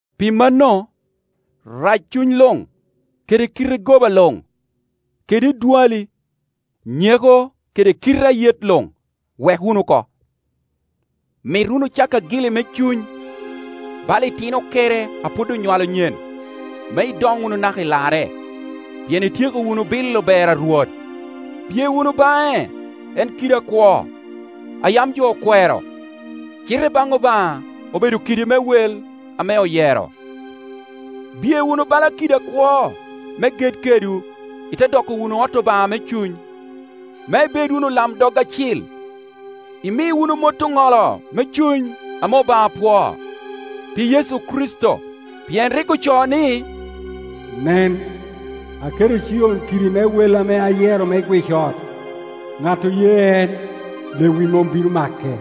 Pi manno, raccuny luŋ, kede kite goba luŋ, kede edwali, nyeko kede kite ayet luŋ, wek wunu oko. Mit wunu cak agili me cuny, bala itino okere a pwod onywalo nyen, me idoŋ wunu naka i larre; pien ityeko wunu bilo ber a Rwot. Biye wunu baŋe, en kidi akwo, a yam jo okwero, cite i baŋ Obaŋa obedo kidi me wel ame oyero. Biye wunu bala kiddi akwo, me ged kedwu ite doko wunu ot Obaŋa me cuny, me ibed wunu olamdog acil, imi wunu mot oŋolo me cuny ame Obaŋa pwoo, pi Yecu Kricito; pien rik ocoo ni, “Nen, aketo i Cion kidi me wel ame ayero me gwic ot, ŋat oye en, lewic mom bino make.”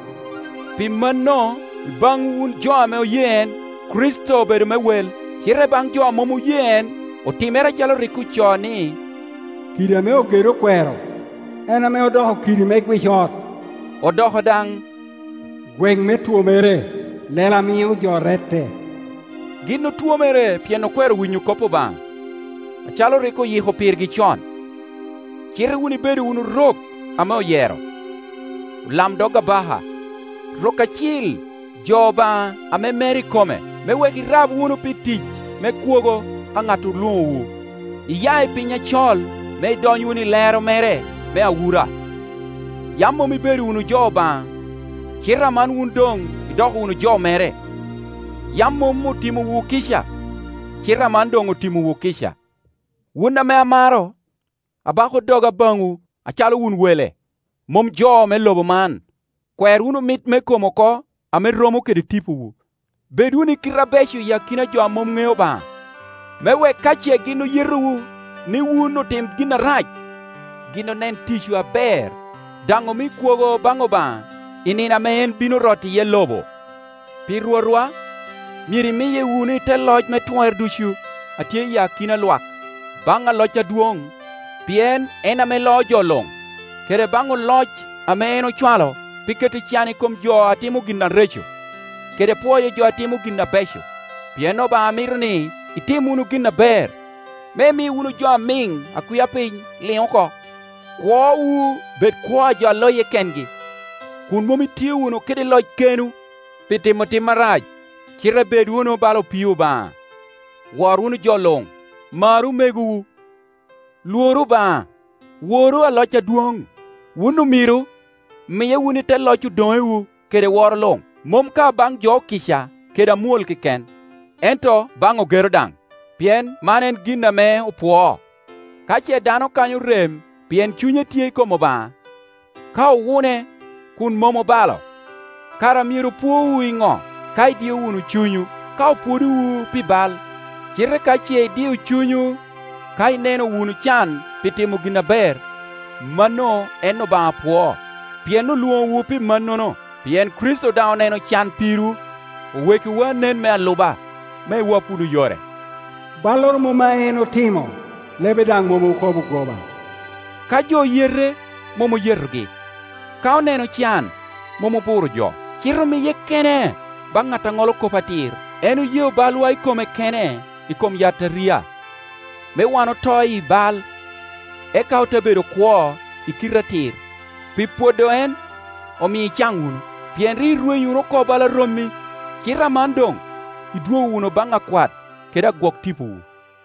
Pi mano, i baŋwu wun jo ame oye en, Kricito obedo me wel; cite i baŋ jo a mom oye en, otimere acalo rik ocoo, ni, “Kidi ame ogedo okwero, en ame odoko kidi me gwic ot.” Odoko daŋ “gweŋ me twomere, lela a mio jo rette.” Gin otwomere pien okwero winyo kop Obaŋa, acalo rik oyiko pirgi con. Cite wun ibedo wunu rok ame oyero, olamdog abaka, rok acil, jo Obaŋa ame mere ikome, me wek irab wunu pi tic me kwogo a ŋat olwoŋowu iya i piny acol me idony wunu i lero mere me awura. Yam mom ibedo wunu jo Obaŋa, cite aman wun, doŋ idoko wunu jo mere; yam mom otimowu kica, cite aman doŋ otimowu kica. Wun ame amaro, abako doga baŋwu, acalo wun wele, mom jo me lobo man, kwer wunu mit me kom oko ame romo kede tipowu. Bed wunu i kite abeco i akina jo a mom ŋeo Obaŋa, me wek ka ce gin oyetowu ni wun otim gin arac, gin onen ticwu aber, daŋ omi kwogo baŋ Obaŋa i nino ame en bino roto iye lobo. Pi Rwotwa, myero imiye wunu i te loc me twer ducu a tye iyi akina lwak; baŋ aloc adwoŋ, pien en ame loo jo luŋ, kede baŋ oloc ame en ocwalo pi keto can i kom jo a timo gin areco, kede pwoyo jo a timo gin abeco. Pien Obaŋa mito ni itim wunu gin aber, me imi wunu jo amiŋ a kwia piny liŋ oko. Kwowu bed kwo a jo a loye kengi, kun mom itio wunu kede lockenwu pi timo tim arac; cite bed wunu bala opii Obaŋa. Wor wunu jo luŋ. Maru omegowu. Lworu Obaŋa. Woru aloc adwoŋ. Wun omiro, miye wunu i te loc odoŋewu kede woro luŋ, mom ka baŋ jo okica kede amwol keken, ento baŋ ogero daŋ. Pien man en gin ame opwoo, ka ce dano kanyo rem pien cunye tye i kom Obaŋa, ka owune kun mom obalo. Kara myero pwowu i ŋo, ka idio wunu cunywu ka opwodowu pi bal? Cite ka ce idiyo cunywu ka ineno wunu can pi timo gin aber, mano en Obaŋa pwoo. Pien olwoŋowu pi mannono; pien Kricito daŋ oneno can pirwu, owekkiwu anen me aluba, me iwap wunu yore. Balloro mom a en otimo, lebe daŋ mom okobo goba. Ka jo oyete, mom oyetogi. Ka oneno can, mom oburo jo; cite omiye kene baŋ ŋat aŋolo kop atir. En oyeo balwa i kome kene i kom yataria, me wan oto i bal, eka ote bedo kwo i kite atir. Pi pwodo en, omio icaŋ wunu. Pien rik irwenyo wunu oko bala rommi, cite aman doŋ idwogo wunu baŋ Akwat kede Agwok tipowu.